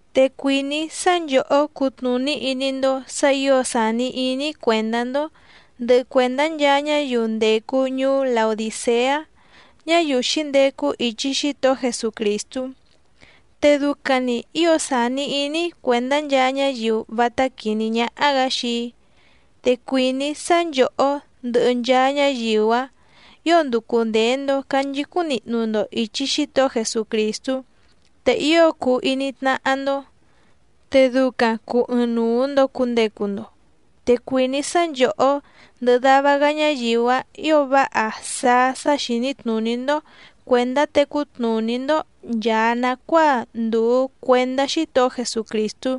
Te cuìní‑í sá nchòhó cutnùní iní‑ndó sǎ ǐo sàni iní‑í cuèndá‑ndó, ndɨhɨ cuèndá nchaa ñáyiu ndècu ñuú Laodìceá, ñáyiu xǐndecu ichi Xítohó Jesucrìstú. Te ducaⁿ‑ni ǐo sàni iní‑í cuèndá nchaa ñáyiu vátá quìní ñáhá‑gǎ xii‑í. Te cuìní‑í sá nchòhó ndɨhɨ nchaa ñáyiu‑áⁿ ǐo nducu ndèe‑ndo canchicúⁿ nihnu‑ndo ìchi Xítohó Jesucrìstú, te ío cuu iní tnáhá‑ndó, te ducaⁿ cùu ɨɨⁿnuu‑ndo cundecu‑ndo. Te cuìní‑í sá nchòhó ndɨhɨ dava‑gá ñáyiu‑áⁿ ǐo váha sáá sá xìní tnùní‑ndó cuèndá tecú tnùní‑ndó nchàa nacuáa ndùu cuendá Xítohó Jesucrìstú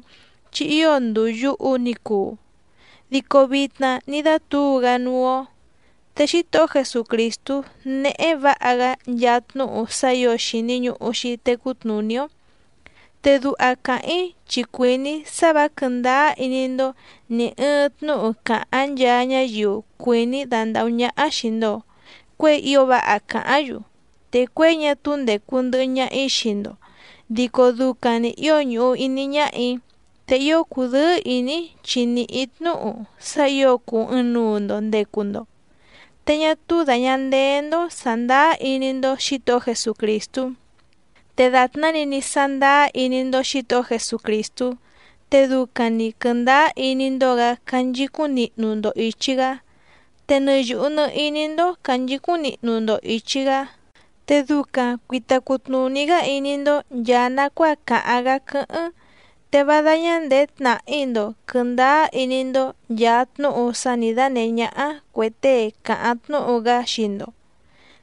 chi ío ndùu yuhu ni cuu, dico vitna ní dátǔu‑gá núú‑ó. Te Xítohó Jesucrìstú néhé vǎha‑gá nchaa tnúhu sá ǐo xìni ñuhu‑xi tecú tnùní‑ó. Te duha càháⁿ‑í chi cuìní‑í sá vǎ quɨ̀ndáá iní‑ndó nì ɨɨⁿ tnúhu càháⁿ nchaa ñáyiu cuìní dandàhú ñáhá xìi‑ndo cuéi ío váha càháⁿ‑yu. Te cuěi ñá túú ndècu ndɨhɨ ñaha‑í xii‑ndo dico ducaⁿ‑ni ǐo ñùhu iní ñáhà‑í, te ío cùdɨ́ɨ́ ìní‑í chi nìhí‑í tnúhu sá ǐo cùu ɨɨⁿnuu‑ndo ndecu‑ndo, te ñá túú dàña ndeé‑ndó sàndáá iní‑ndó Xǐtohó Jesucrìstú. Te dàtná‑ni ní sándáá iní‑ndó Xǐtohó Jesucrìstú, te ducaⁿ‑ni quɨ̀ndáá iní‑ndó‑gǎ canchicúⁿ nihnu‑ndo ìchi‑gá. Te nɨ yùhu nɨ iní‑ndó cànchicúⁿ nihnu‑ndo ìchi‑gá, te ducaⁿ cuìta cutnuní‑gá iní‑ndó nchàa nacuáa càháⁿ‑gá quɨ́hɨ́ⁿ. Te vá dáñá ndèé tnàhí‑ndo quɨ̀ndáá iní‑ndó nchàa tnúhu sá nǐ dánèhé ñáhá cuè tée càháⁿ tnúhu‑gá xii‑ndo.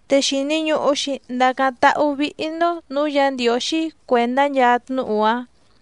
Te xìni ñuhu‑xi ndacáⁿ táhú vìhi‑ndo núú Yǎ Ndiǒxí cuèndá nchaa tnúhu‑áⁿ.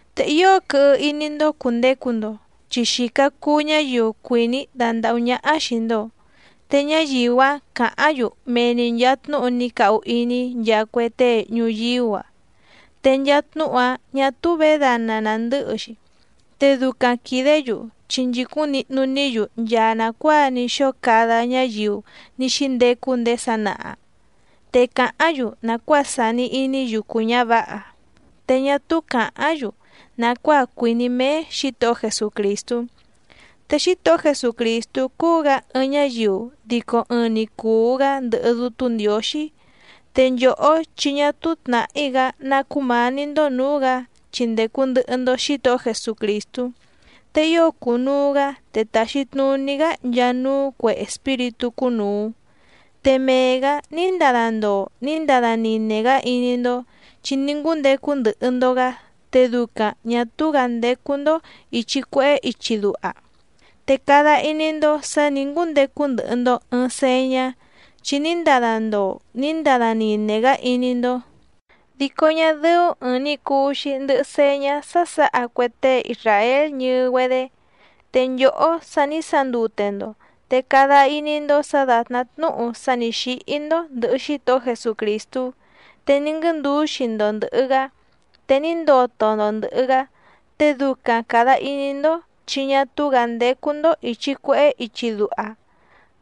Te ío quɨhɨ iní‑ndó cùndecu‑ndo chi xìca cuu ñáyiu cuìní dandàhú ñáhá xìi‑ndo, te ñáyiu‑áⁿ càháⁿ‑yu mee‑ni nchàa tnúhu ní cahu iní nchaa cue tée ñuyíú‑a, te nchaa tnúhu‑áⁿ ñǎ túú vědana nàndɨ́hɨ‑xi. Te ducaⁿ quìdé‑yu chi nchìcúⁿ nihnu‑ní‑yu nchaa nàcuáa ní xóo cada ñáyiu ní xíndecu ndéé sanaha. Te càháⁿ‑yu nàcuáa sàni iní yucu ñǎvǎha, te ñá túú càháⁿ‑yu nàcuáa cuìní méé Xǐtohó Jesucrìstú. Te Xítohó Jesucrìstú cúú‑gǎ ɨɨⁿ ñáyiu dico ɨɨⁿ‑ni cùu‑gá ndɨhɨ Dútú Ndiǒxí. Te nchòhó chi ñá túú tnàhí‑gá ná cúmǎní‑ndó nǔú‑gǎ chi ndècu ndɨhɨ‑ndo Xítohó Jesucrìstú. Te ío cùnuu‑gá te tàxi tnuní‑gá nchaa núú cuè espíritú cúnùu. Te mee‑gǎ ní ndada ndoo ní ndada nine‑gá iní‑ndó chi ní ngúndecu ndɨhɨ‑ndo‑gǎ te ducaⁿ ñà túú‑gǎ ndécú‑ndó ìchi cuehé ichi duha, te cada iní‑ndó sǎ nǐ ngúndecu ndɨhɨ‑ndo ɨ̀ɨⁿ señá, chi ní ndada ndoo ní ndada nine‑gá iní‑ndó, dico ñá dɨ́ú ɨ̀ɨⁿ‑ni cuu‑xi ndɨhɨ señá sá sǎha cue tée isràél ñɨɨ‑güedé. Te nchòhó sa ní sandute‑ndo te cada iní‑ndó sǎ dàtná tnúhu sá nǐ xíhí‑ndó ndɨ̀hɨ Xítohó Jesucrìstú, te ní nguɨ́ndǔxi‑ndo ndɨ̀hɨ‑gá, te ní ndoto‑ndo ndɨ̀hɨ‑gá, te ducaⁿ càda iní‑ndó chi ñá túú‑gǎ ndécú‑ndó ìchi cuehé ichi duha.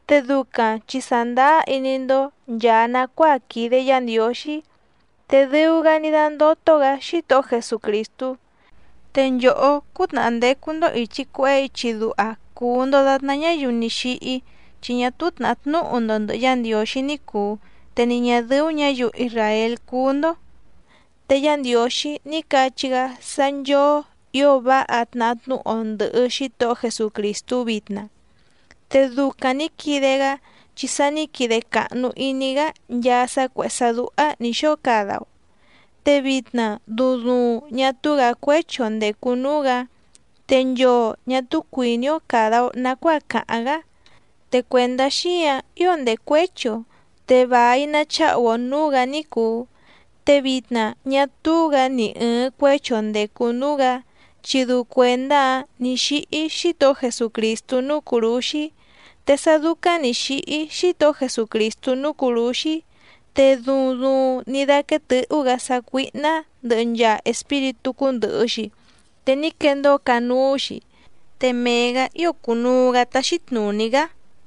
Te ducaⁿ chi sàndáá iní‑ndó nchàa nacuáa quìde Yá Ndiǒxí, te dɨu‑gá ní dándótó‑gǎ Xítohó Jesucrìstú. Te nchòhó cútnàhá ndécú‑ndó ìchi cuehé ichi duha cùu‑ndo datná ñáyiu ní xíhí, chi ñá túú tnàhá tnúhu‑ndo ndɨ̀hɨ Yá Ndiǒxí ní cùu, te ni ñà dɨ́ú ñǎyiu isràél cúú‑ndó. Te Yá Ndiǒxí ní cachí‑gá sá nchóó ǐo váha tnahá tnúhu‑o ndɨ̀hɨ Xítohó Jesucrìstú vitna. Te ducaⁿ nǐ quide‑gá chi sa ní quide càhnu iní‑gá nchaa sá cuèhé sá dúhá nǐ xóo cada‑o. Te vitna duuⁿ duuⁿ ñá túú‑gǎ cuéchi‑o ndècu núú‑gǎ. Te nchoo ñà túú cuìní‑ó càda‑o nacuáa càháⁿ‑gá, te cuèndá xíǎⁿ ío ndècuéchi‑o, te vài nacháhu‑o nǔú‑gǎ ní cùu. Te vitna ñá túú‑gǎ ni ɨ̀ɨⁿ cuéchi‑o ndècu núú‑gǎ, chi dɨu cuèndá‑áⁿ nǐ xíhí Xítohó Jesucrìstú núú cùrúxí. Te sá dúcáⁿ nǐ xíhí Xítohó Jesucrìstú núú cùrúxí, te duuⁿ duuⁿ ní dáquéé tɨ̌hú‑gǎ sácuíhná ndɨhɨ nchaa espíritú cúndɨ̀hɨ‑xi, te ní quendóo canúú‑xi, te mee‑gǎ ío cùnuu‑gá táxí tnùní‑gá.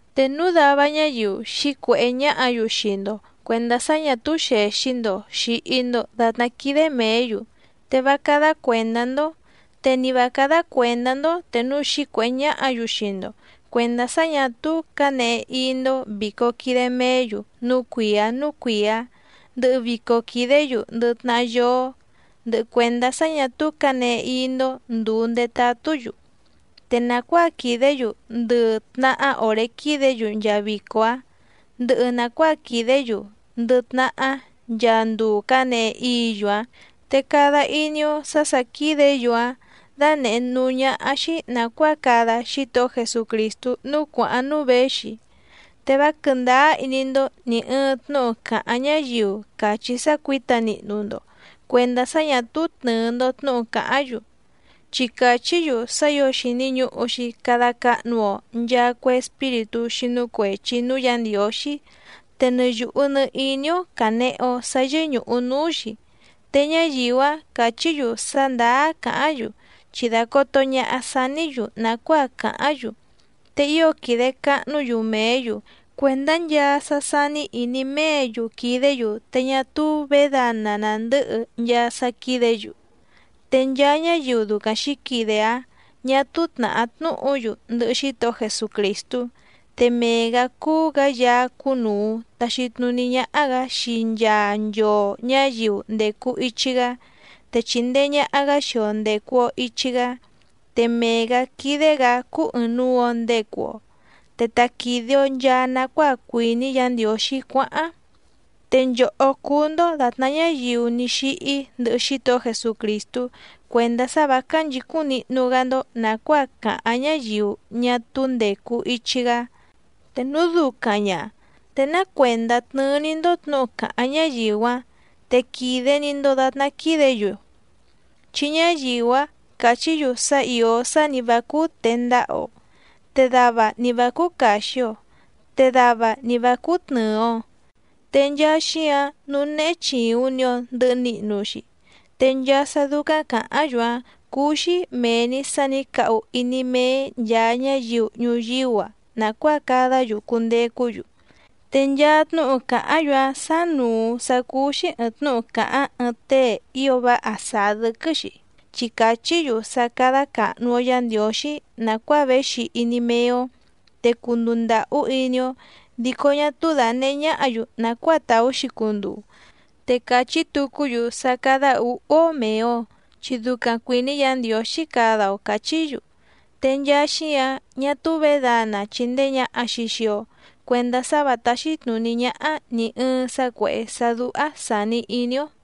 Te núu dava ñáyiu xǐcuèhé ñáhǎ‑yu xii‑ndo cuèndá sá ñà túú xèxi‑ndo xìhi‑ndo datná quídé mèé‑yu te vá cádá cuèndá‑ndó, te ni vǎ cádá cuèndá‑ndó te núu xǐcuèhé ñáhǎ‑yu xii‑ndo cuèndá sá ñà túú cǎnehe íí‑ndó vìco quide meé‑yu núú cuìá núú cuìá, ndɨhɨ vico quìdé‑yu ndɨ tnahá yóó, ndɨhɨ cuèndá sá ñà túú cǎnehe íí‑ndó ndùu ndetatú‑yu. Te nàcuáa quìdé‑yu ndɨ tnahá òré quídě‑yu nchaa vico‑áⁿ, ndɨhɨ nàcuáa quìdé‑yu ndɨ tnahá nchaa nduu cǎnehe íǐ‑yu‑áⁿ, te cada iní‑ó sǎ sà quídě‑yu‑áⁿ dánèhé núú ñáhá‑xí nàcuáa cada Xítohó Jesucrìstú núú cuàháⁿ núú věxi. Te vá quɨ̀ndáá iní‑ndó nì ɨɨⁿ tnúhu càháⁿ ñáyiu càchí sá cuǐta nihnu‑ndo cuèndá sá ñǎ túú tnɨ̀ɨ‑ndo tnúhu càháⁿ‑yu, chi càchí‑yu sá ǐo xìni ñuhu‑xi cada cahnu‑o nchaa cue espíritú xínú cuèchi núú Yǎ Ndiǒxí, te nɨ yùhu nɨ iní‑ó cànehe‑o sá yɨ́ñùhu núú‑xi. Te ñáyiu‑áⁿ càchí‑yu sá ndàá càháⁿ‑yu chi dàcoto ñaha saní‑yu nàcuáa cáháⁿ‑yu, te ío quìde cahnú‑yu mèé‑yu cuèndá nchaa sá sání ìní méě‑yu quìdé‑yu, te ñá túú vědana nàndɨ́hɨ nchaa sá quídě‑yu. Te nchaa ñáyiu ducaⁿ xǐquide‑áⁿ ñà túú tnàhá tnúhu‑yu ndɨhɨ Xítohó Jesucrìstú. Te mee‑gǎ cúú‑gǎ Yaá cúnùu taxi tnuní ñáhá‑gǎ xii nchaa nchoo ñǎyiu ndècu ichi‑gá, te chìndee ñaha‑gá xii‑o ndècu‑o ichi‑gá, te mee‑gǎ quídé‑gǎ cúú ɨ̀ɨⁿnuu‑o ndecu‑o, te ta quìde‑o nchaa nacuáa cuìní Yǎ Ndiǒxí cuáháⁿ. Te nchòhó cúú‑ndó dàtná ñáyiu ní xíhí ndɨhɨ Xítohó Jesucrìstú cuèndá sá vǎ cánchìcúⁿ nihnu‑gá‑ndó nàcuáa càháⁿ ñáyiu ñá túú ndècu ichi‑gá. Te núu ducaⁿ ña, ¿te ná cuèndá tnɨ́ɨ́‑ní‑ndó tnǔhu càháⁿ ñáyiu‑áⁿ te quìde‑ni‑ndo datná quídě‑yu? Chi ñáyiu‑áⁿ càchí‑yu sá ìó sá ni vǎ cúú tèe ndaha‑o, te dava ni vǎ cúú càxi‑o, te dava ni và cúú tnɨ̀ɨ‑o. Te nchaa xíǎⁿ, núú néhé chìuⁿ‑ni‑o ndɨhɨ nihnu‑xi. Te nchaa sá dúcáⁿ càháⁿ‑yu‑áⁿ cúú‑xí mèe‑ni sá nǐ cahu iní méé nchàa ñáyiu ñuyíú‑a nàcuáa cadá‑yu cundecú‑yu. Te nchaa tnúhu càháⁿ‑yu‑áⁿ sánùu sá cúú‑xí ɨ̀ɨⁿ tnúhu càháⁿ ɨɨⁿ tée ío váha sàá dɨ́quɨ́‑xi, chi càchí‑yu sá cádá càhnu‑o Yá Ndiǒxí nàcuáa véxi iní méé‑ó, te cunduu ndàhú iní‑ó dico ñá túú dànehé ñáhǎ‑yu nàcuáa tàú‑xi cunduu. Te càchí tucú‑yu sá cádá ǔhú‑ó mèe‑o, chi ducaⁿ cuìní Yǎ Ndiǒxí cada‑o càchí‑yu. Te nchaa xíǎⁿ ñá túú vědana chìndee ñaha‑xi xii‑o cuendá sá và táxí tnùní ñáhá nì ɨɨⁿ sá cuèhé sá dúhá sàni iní‑ó.